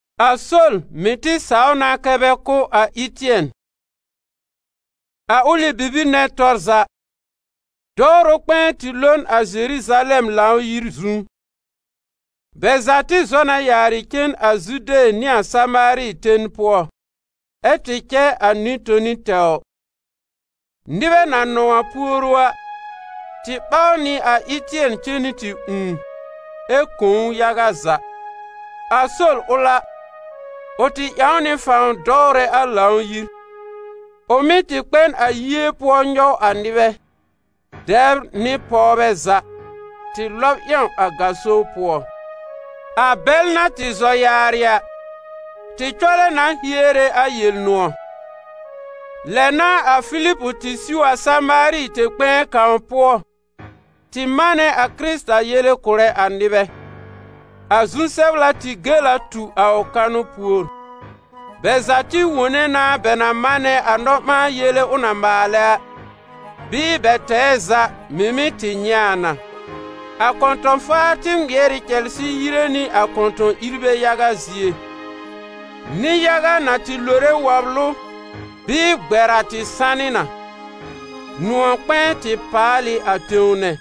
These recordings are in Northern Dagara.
A Sol mɩ̀ tɩ saw na kɛ́ bɛ kʋ́ a Ɩtɩɛn. A ʋlɩ bibir nɛ tɔr za, dɔwrʋ kpɛ̃ɛ tɩ lo n a Zeruzalɛm Lãw-yir zu. Bɛ za tɩ zɔ na yaarɩ cen a Zude nɩ a Samaari ten pʋɔ, ɛ tɩ cɛ a nɩ-toni tɛwr. Nɩbɛ na nɔ̃w a puoru a, tɩ ɓaw nɩ a Ɩtɩɛn cen nɩ tɩ ũù, ɛ kõ ʋ yaga za. A Sol ʋl a, ʋ tɩ ƴãw nɩ fãw dɔwrɛ a Lãw-yir. Ʋ mɩ́ tɩ kpɛ n a yie pʋɔ nyɔw nɩbɛ, dɛbr nɩ pɔwbɛ za, tɩ lɔb ƴãw a gaso pʋɔ. A bɛl na tɩ zɔ yaarɩ a, tɩ cɔlɛ na hiere a Yel-nʋ̃ɔ̀. Lɛ n'a a Filib tɩ siw a Samaari tẽ-kpɛ̃ɛ kãw pʋɔ tɩ manɛ a Kɩrɩta yele kʋ̀rɛ a nɩbɛ. A zu-sɛbla tɩ gel a tu a ʋ kanʋ pùor: bɛ za tɩ wone na bɛ na manɛ a nɔ-ɓãa-yele ʋ na maalɛ a, bɩɩ bɛ tɛɛ za mɩ̀ mɩ́ tɩ nyɛ̃ a na. A kɔ̃tɔ̃-faar tɩ ŋmɩɛr ɩ cɛlsɩ yire nɩ a kɔ̃tɔ̃-ìrbɛ yaga zie. Nɩ-yaga na tɩ lore wɔblʋ bɩɩ gbɛr a tɩ sanɩ na. Nʋ̃ɔ̀-kpɛ̃ɛ tɩ paalɩ a tẽw nɛ.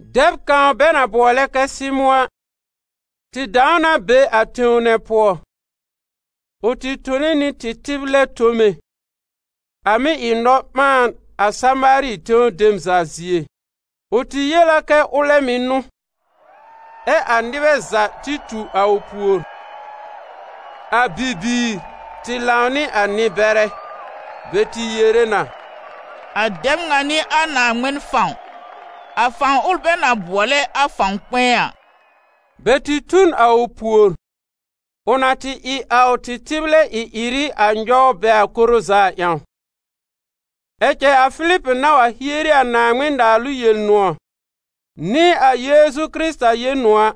Dɛb kãw bɛ na bʋɔlɛ kɛ Sɩmʋ̃ a, tɩ dãw na be a tẽw nɛ pʋɔ. Ʋ tɩ tone nɩ tɩtɩblɛ tome, a mɩ́ ɩ nɔ-ɓãan a Samaari tẽw dem za zie. Ʋ tɩ yel a kɛ ʋlɛ mɩ̀ n'ʋ, ɛ a nɩbɛ za tɩ tu a ʋ pùor, a bibiir tɩ lãw nɩ a nɩ-bɛrɛ. Bɛ tɩ yere na: «A dɛb ŋa n'ɩ a Naaŋmɩn fãw, a fãw ʋl bɛ na bʋɔlɛ a fãw kpɛ̃ɛ a.» Bɛ tɩ tu n a ʋ pùor, ʋ na tɩ ɩ a ʋ tɩtɩblɛ ɩ-ɩrɩ a nyɔw bɛ a koro za a ƴãw. Ɛ cɛ a Filib na wa hieri a Naaŋmɩn-Naalʋ Yel-nʋ̃ɔ̀ nɩ a Yeezu Kɩrɩta Yel-nʋ̃ɔ̀ a,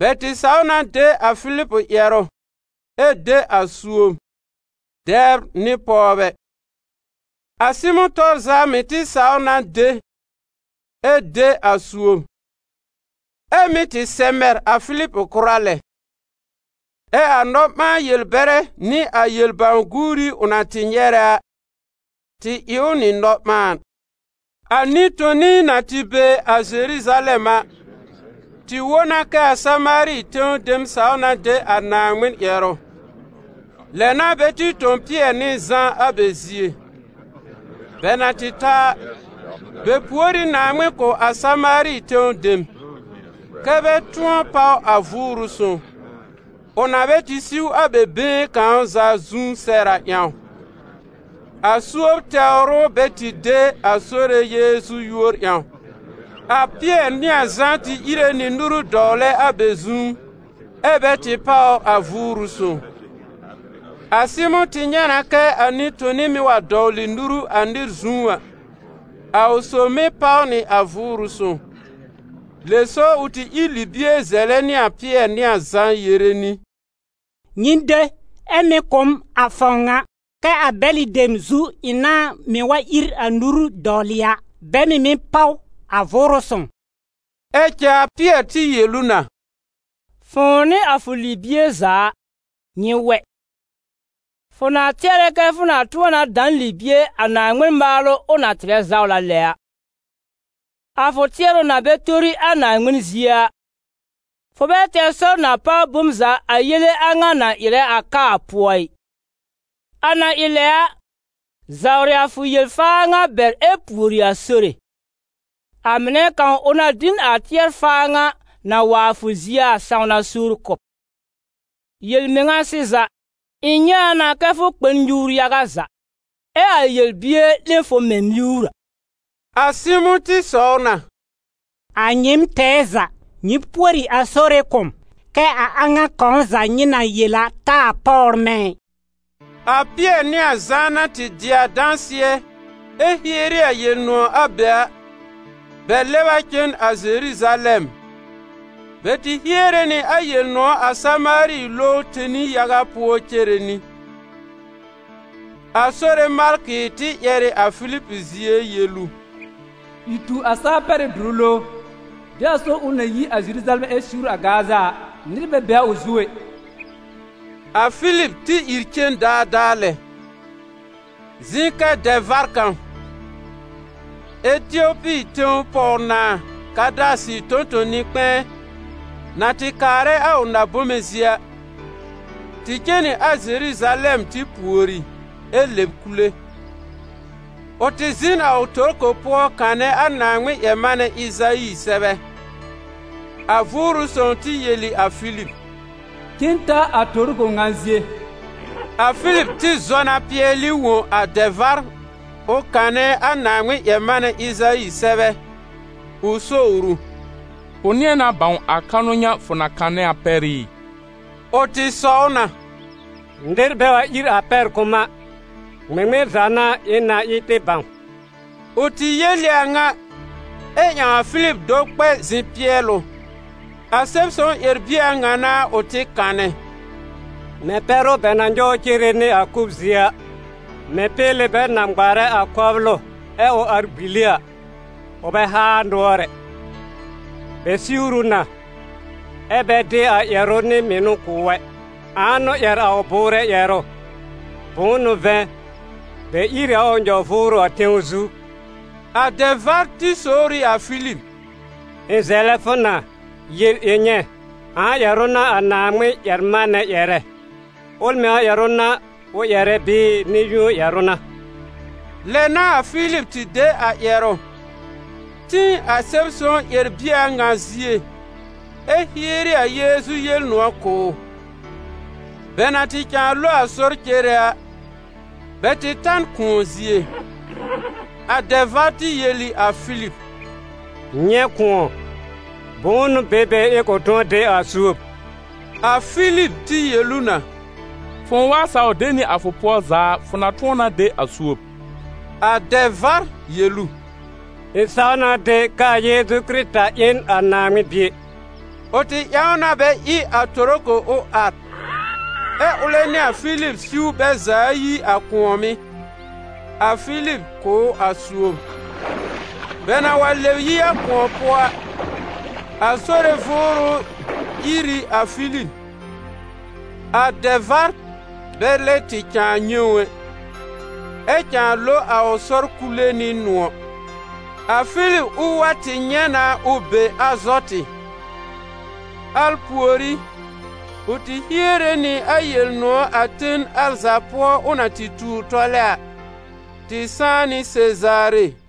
bɛ tɩ saw na de a Filib ƴɛrʋ ɛ de a suob, dɛbr nɩ pɔwbɛ. A Sɩmʋ̃ tɔr za mɩ̀ tɩ saw na de ɛ de a suob, ɛ́ mɩ́ tɩ sɛ̀b mɛr a Filib kʋra lɛ. Ɛ a nɔ-ɓãa-yel-bɛrɛ nɩ a yel-bãw-guuri ʋ na tɩ nyɛrɛ a, tɩ ɩ ʋ nɩ nɔ-ɓãan. A nɩ-toni, na tɩ be a Zeruzalɛm a, tɩ wõ na kɛ a Samaari tẽw dem saw na de a Naaŋmɩn ƴɛrʋ. Lɛ n'a bɛ tɩ tõ Pɩɛr nɩ Zã a bɛ zie. Bɛ na tɩ ta a, bɛ pùor ɩ Naaŋmɩn kʋ̀ a Samaari tẽw dem, kɛ́ bɛ tʋ̃ɔ páw a Vʋʋrʋ Sõw, ʋ na bɛ tɩ siw a bɛ been kãw za zu sɛr a ƴãw: a suob tɛwr ʋ bɛ tɩ de a Sore Yeezu yúor ƴãw. A Pɩɛr nɩ a Zã tɩ íre nɩ nuru dɔwlɛ a bɛ zu, ɛ́ bɛ tɩ páwr a Vʋʋrʋ Sõw. A Sɩmʋ̃ tɩ nyɛ̃ na kɛ a nɩ-toni mɩ́ wa dɔwlɩ nuru a nɩr zu a, a ʋ sob mɩ́ páw nɩ a Vʋʋrʋ Sõw. Lɛ so ʋ tɩ ír libie zɛlɛ nɩ a Pɩɛr nɩ a Zã yere nɩ: «Nyɩ de, ɛ mɩ̀ kʋ̀ m a fãw ŋa, kɛ́ a bɛlɩ dem zu ɩ̃ nãá mɩ́ wa ír a nuru dɔwlɩ a, bɛ mɩ̀ mɩ́ páw a Vʋʋrʋ Sõw.» Ɛ cɛ a Pɩɛr tɩ yel ʋ na: «Fʋ̃ʋ nɩ a fʋ libie za a, nyɩ wɛ! Fʋ na tɩɛrɛ kɛ́ fʋ na tʋ̃ɔ na da n libie a Naaŋmɩn maalʋ ʋ na tɩrɛ zawla lɛ a! A fʋ tɩɛrʋ na bɛ tori a Naaŋmɩn zie a, fʋ bɛ tɛr sɔr na páw bom za a yele a ŋa na ɩrɛ a ka a pʋɔ ɩ. A na ɩ lɛ a, zawrɩ a fʋ yel-faa ŋa bɛr ɛ pùori a Sore: a mɩnɛ kãw ʋ na dɩ n a tɩɛr-faa ŋa, na wa a fʋ zie a, sãwna suur kʋ̀ b. Yel-mɩŋa sɩza, ɩ̃ nyɛ̃ a na fʋ kpɛ n nyuur yaga za, ɛ a yel-bier 'lẽ fʋ mɛ̃ miwr a.» A Sɩmʋ̃ tɩ sɔw na: «A nyɩɩm tɛɛ za, nyɩ pùori a Sore kʋ̀ m, kɛ a a ŋa kãw za nyɩ na yel a taa páwr mɛ̃ ɩ.» A Pɩɛr nɩ a Zã na tɩ dɩ a dãsɩɛ ɛ hieri a Yel-nʋ̃ɔ̀ a be a, bɛ lɛb a cen a Zeruzalɛm. Bɛ tɩ hiere nɩ a Yel-nʋ̃ɔ̀ a Samaari lowr tẽli yaga pʋɔ cere nɩ. A Sore malkɩ tɩ ƴɛr ɩ a Filib zie yel ʋ: «Ìr tu a saa-pɛrɩ́-dʋrʋ lowr, de a sɔr ʋl na yi a Zeruzalɛm ɛ siwr a Gaza a, nɩr bɛ be a ʋ zu ɛ.» A Filib tɩ ìr cen daadaa lɛ. Zɩ̃ kɛ dɛ-vár kãw, Etiopi tẽw pɔw-nãà Kãdasɩ tõ-tõ-nɩ-kpɛ̃ɛ, na tɩ kaarɛ a ʋ na-bome zie a, tɩ cen nɩ a Zeruzalɛm tɩ pùori ɛ lɛb kule. Ʋ tɩ zɩ̃ n a ʋ torko pʋɔ kanɛ a Naaŋmɩn-ƴɛr-manɛ Ɩzayi sɛbɛ. A Vʋʋrʋ Sõw tɩ yel ɩ a Filib: «Cen ta a torko ŋa zie.» A Filib tɩ zɔ na pɩɛlɩ wõ a dɛ-vár ʋ kanɛ a Naaŋmɩn-ƴɛr-manɛ Ɩzayi sɛbɛ, ʋ sowr ʋ: «Fʋ nɩ̃ɛ na bãw a kanʋ ŋa fʋ na kanɛ a pɛr ɩ?» Ʋ tɩ sɔw na: «Nɩr bɛ wa ír a pɛr kʋ̀ m a, ŋmɩŋmɩn za n'a ɩ̃ na ɩ tɩ bãw?» Ʋ tɩ yel ɩ a ŋa, ɛ ƴãw a Filib do kpɛ zɩ̃ pɩɛl ʋ. A Sɛb-sõw ƴɛr-bie a ŋa n'a ʋ tɩ kanɛ: ‹Mɛ̃ pɛ́rʋ bɛ na nyɔw cere nɩ a kʋ́b zie a, mɛ̃ péle bɛ na ŋmarɛ a kɔblʋ ɛ ʋ ar gbili a, ʋ bɛ haa nʋɔr ɛ. Bɛ siwr ʋ na, ɛ́ bɛ dɩ a ƴɛrʋ nɩ mɩnʋ kʋ̀ ʋ ɛ. Ãa n'ʋ ƴɛr a ʋ bʋʋrɛ ƴɛrʋ? Bʋ̃ʋ n'ʋ vɛ̃, bɛ ír ɩ a ʋ nyɔ-vʋʋrʋ a tẽw zu.› A dɛ-vár sowr ɩ a Filib: «Ɩ̃ zɛlɛ fʋ na, yel ɩ̃ nyɛ̃, ãa ƴɛrʋ n'a a Naaŋmɩn-ƴɛr-manɛ ƴɛrɛ? Ʋl mɩŋa ƴɛrʋ n'a ʋ ƴɛrɛ bɩɩ nɩ-yũo ƴɛrʋ n'a?» Lɛ n'a a Filib tɩ de a ƴɛrʋ, tĩ a Sɛb-sõw ƴɛr-bie a ŋa zie ɛ hieri a Yeezu Yel-nʋ̃ɔ̀ kʋ̀ ʋ. Bɛ na tɩ cãa lo a sɔr cere a, bɛ tɩ ta n kʋ̃ɔ zie. A dɛ-vár tɩ yel ɩ a Filib: «Nyɛ̃ kʋ̃ɔ, bʋ̃ʋ n'ʋ be be ɩ̃ kʋ̃ tʋ̃ɔ de a suob?» [ A Filib tɩ yel ʋ na: «Fʋ̃ʋ wa saw de nɩ a fʋ pʋɔ za a, fʋ na tʋ̃ɔ na de a suob.» A dɛ-vár yel ʋ: «Ɩ̃ saw na de k'aa Yeezu Kɩrɩta ɩ n a Naaŋmɩn Bie.»] Ʋ tɩ ƴãw na bɛ ɩ a torko ʋ ar, ɛ ʋlɛ nɩ a Filib siw bɛ za ayi a kʋ̃ɔ̀mɩ́, a Filib kʋ̀ ʋ a suob. Bɛ na wa lɛb yi a kʋ̃ɔ pʋɔ a, a Sore Vʋʋrʋ ír ɩ a Filib. A dɛ-vár bɛ lɛ tɩ cãa nyɛ̃ ʋ ɛ, ɛ cãa lo a ʋ sɔr kule nɩ nʋ̃ɔ̀. A Filib ʋl wa tɩ nyɛ̃ na ʋ be Azɔtɩ. Al pùorí, ʋ tɩ hiere nɩ a Yel-nʋ̃ɔ̀ a ten al za pʋɔ ʋ na tɩ tuur tɔlɛ a, tɩ sãá nɩ Sezaare.